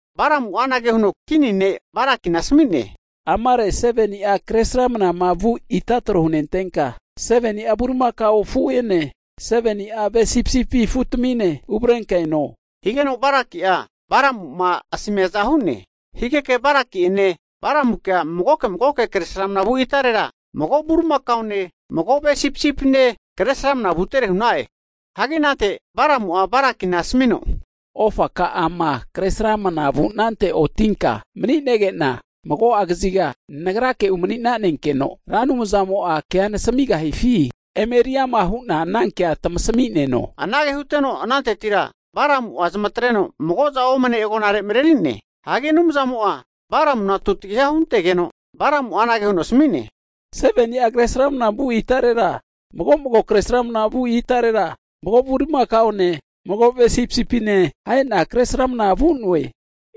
Balamu'a anage huno kini ne' Balakina asmi'ne, amare 7ni'a kresramnama vu ita tro hunentenka, 7ni'a bulimakao afu'ene 7ni'a ve' sipisipi afutamine uvrenka eno. Higeno Balaki'a Balamu'ma asamiaza hu'ne. Higeke Balaki'ene Balamukea magoke magoke kresramna vu itarera mago bulimakaone mago ve sipisipine kresramna vutere hu'na'e. Hagi Balamu'a anante Balakina asamino, ofaka'ama kresramna vunante otinka mani'nege'na, mago'a kaziga nagrake umani'nanenkeno Ra Anumzamo'a kea nasamigahifi emeriama hu'na anankea tamasami'neno. Anage huteno anantetira Balamu'a zamatreno mago'za omane agonarega marerine. Hagi Anumzamo'a Balamuna tutagiha huntegeno, Balamu'a anage huno asami'ne, nagra 7ni'a kresramna vu itarera mago'mago kresramna vu itarera mago bulimakaone, mago ve sipisipine ahe'na kresramna vu'noe.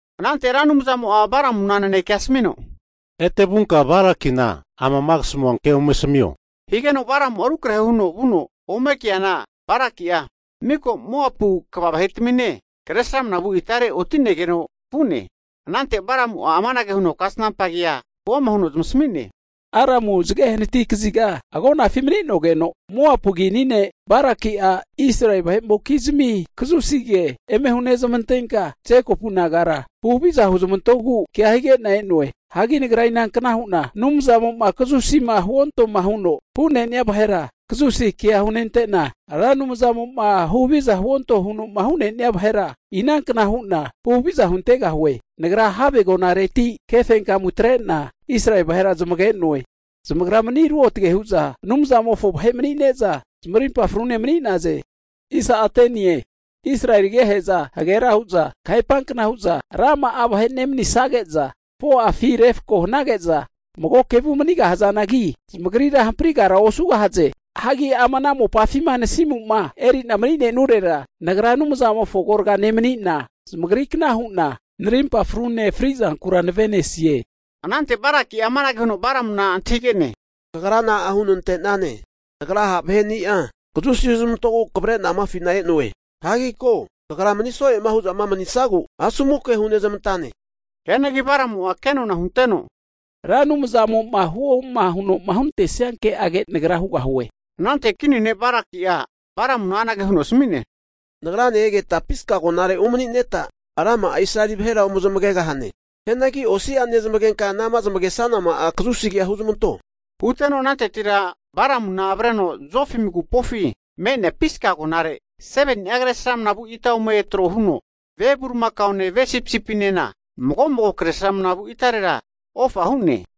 Anante Ra Anumzamo'a Balamuna nanekea asamino, Ete vunka Balakina amama kasamu kea ome asamio. Higeno Balamu'a rukrahe huno vuno, ome keana Balaki'a miko Moapu kva vahetamine kresramnama vu itare oti'negeno vu'ne. Anante Balamu'a amanage huno kasnampa kea huama huno zamasami'ne, Aramu zage hanati kaziga agonafi mani'nogeno Moapu kini ne' Balaki'a Israeli vahe'mokizmi kazusi ke eme hunezmantenka, Jekopu nagara huhaviza huzmantogu kea hige'na e'noe. Hagi nagra inankna hu'na Anumzamo'ma kazusima huontoma huno hu'nenia vahera, kazusinkea hunentena, Ra Anumzamo'ma huhaviza huonto huno'ma hu'nenia vahera, inankna hu'na huhaviza huntegahue? Nagra have agonareti kefenkamu atre'na Israeli vahera zamage'noe. Zamagra mani ruotage hu'za Anumzamofo vahe mani'ne'za zamarimpa frune mani'naze. Israeli agehe'za hagera hu'za kahepankna hu'za rama'a vahe nemanisage'za, 4'afi refko hanage'za mago kevu manigahazanagi zamagrira hamprigara osugahaze. Hagi ama mopafima nasimu'ma eri'na mani'nenurera, nagra Anumzamofo agorga nemanina, zamagrikna hu'na narimpa frune frizankura nave'nesie. Anante Balaki'a amanage huno Balamuna antahige'ne. Kagra na'a hunenantane? Nagra ha' vahe'ni'a kazusi huzmantogu kavrena amafina e'noe. Hagi ko! Kagra mani soe'ma hu'zama manisagu asomu ke hunezmantane! Hianagi Balamu'a kenona hunteno, Ra Anumzamo'ma huoma huno hunantesia ke'age nagra hugahue hu'ne. Anante kini ne Balaki'a Balamuna anage huno asmi'ne, Nagrane egeta Pisga agonare umanineta rama'a Israeli vahera ozmagegahane. Hianagi osi'a nezmagenka anama zamagesanama'a kazusi kea huzmanto, Huteno anantetira Balamuna avreno Zofim agupofi me'nea Piska agonare, 7ni'a kresramna vu ita ome tro huno, ve bulimakaone ve sipisipinena mago'mago kresramna vu itarera ofa hu'ne.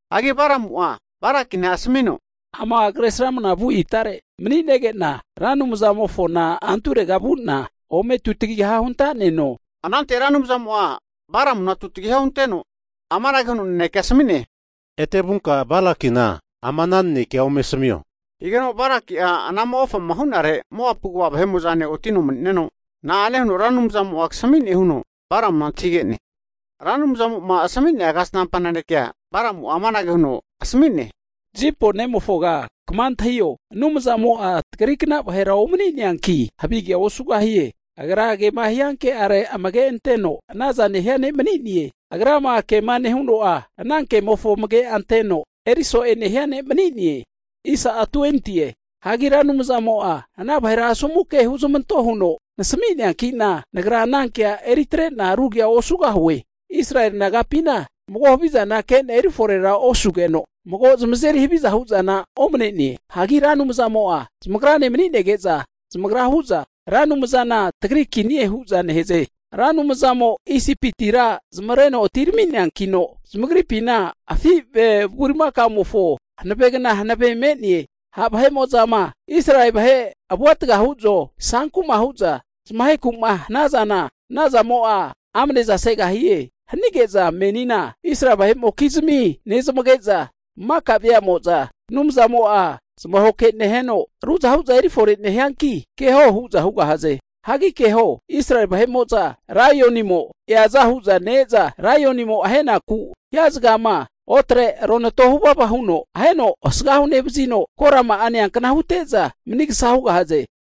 Hagi Balamu'a Balakina asamino, ama kresramna vu itare mani'nege'na Ra Anumzamofona anturega vu'na ome tutagiha huntaneno. Anante Ra Anumzamo'a Balamuna tutagiha hunteno amanage huno nanekea asami'ne, Ete vunka Balakina ama ana naneke ome asamio. Higeno Balaki'a anama ofama hu'nere Moapu kva vahe'mo'zane otino mani'neno, na'ane huno Ra Anumzamo'a kasami'ne huno Balamuna antahige'ne? Ra Anumzamo'ma asami'nea kasnampa nanekea Balamu'a amanage huno asami'ne, Zipori nemofoga kama antahio, Anumzamo'a tagrikna vahera omani'neankino, havigea osugahie. Agra kema hia kere amage anteno anaza nehia ne' mani'ne. Agrama kema nehuno'a, ana kemofo amage anteno eri so'e nehia ne' mani'ne. Hagi Ra Anumzamo'a ana vahera asomu ke huzamanto huno nasami'neanki'na, nagra ana kea eritrena ru kea osugahue. Israeli nagapina koana mago havizana kena eriforera osugeno, mago zamazeri haviza hu'zana omanene. Hagi Ra Anumzamo'a zamagrane mani'nege'za, zamagra hu'za Ra Anumzana tagri kinie hu'za nehaze. Ra Anumzamo Isipitira zamavareno atirami'neankino zamagripina afi' ve bulimakaomofo hanavegna hanave me'ne. Ha' vahe'mo'zama Israeli vahe avuatga hu'zo, sankuma hu'za zamaheku'ma hanazana, anazamo'a amne'za segahie. Hanige'za menina Israeli vahe'mokizmi nezmage'za maka veamo'za, Anumzamo'a zamahoke neheno ruzahu'za erifore nehianki, keho hu'za hugahaze. Hagi keho, Israeli vahe'mo'za laionimo eaza hu'za ne-eza, laionimo ahenaku hia zagama otre ronato huvava huno aheno asgahu nevazino korama'a neankna hute'za, manigsa hugahaze.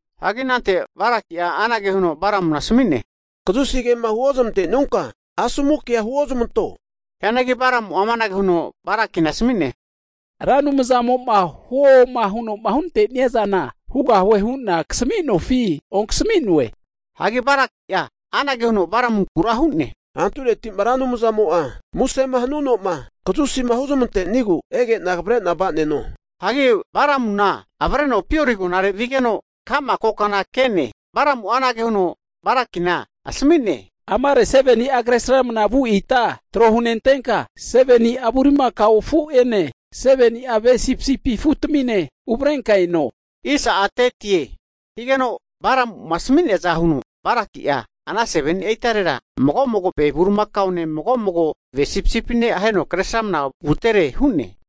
Hagi anante Balaki'a anage huno Balamuna asmi'ne, Kazusi kema huozamante'nunka asomu kea huozamanto. Hianagi Balamu'a amanage huno Balakina asami'ne, Ra Anumzamo'ma huoma huno hunante'nia zana hugahue hu'na kasami'nofi onkasami'noe? Hagi Balaki'a anage huno Balamunkura hu'ne, Antureti'ma Ra Anumzamo'a musema huno'ma kazusima huzamantenigu ege'na kavre'na vaneno. Hagi Balamuna avreno Peori agonare vigeno, ka'ma kokana ke'ne Balamu'a anage huno Balakina asmi'ne, amare 7ni'a kresramna vu ita tro hunentenka, 7ni'a bulimakao afu'ene 7ni'a ve sipisipi afutamine uvrenka eno. Higeno Balamu'ma asmiaza huno Balaki'a, Ana 7ni'a itarera mago mago ve bulimakaone, mago mago ve sipisipine aheno kresramna vutere hu'ne.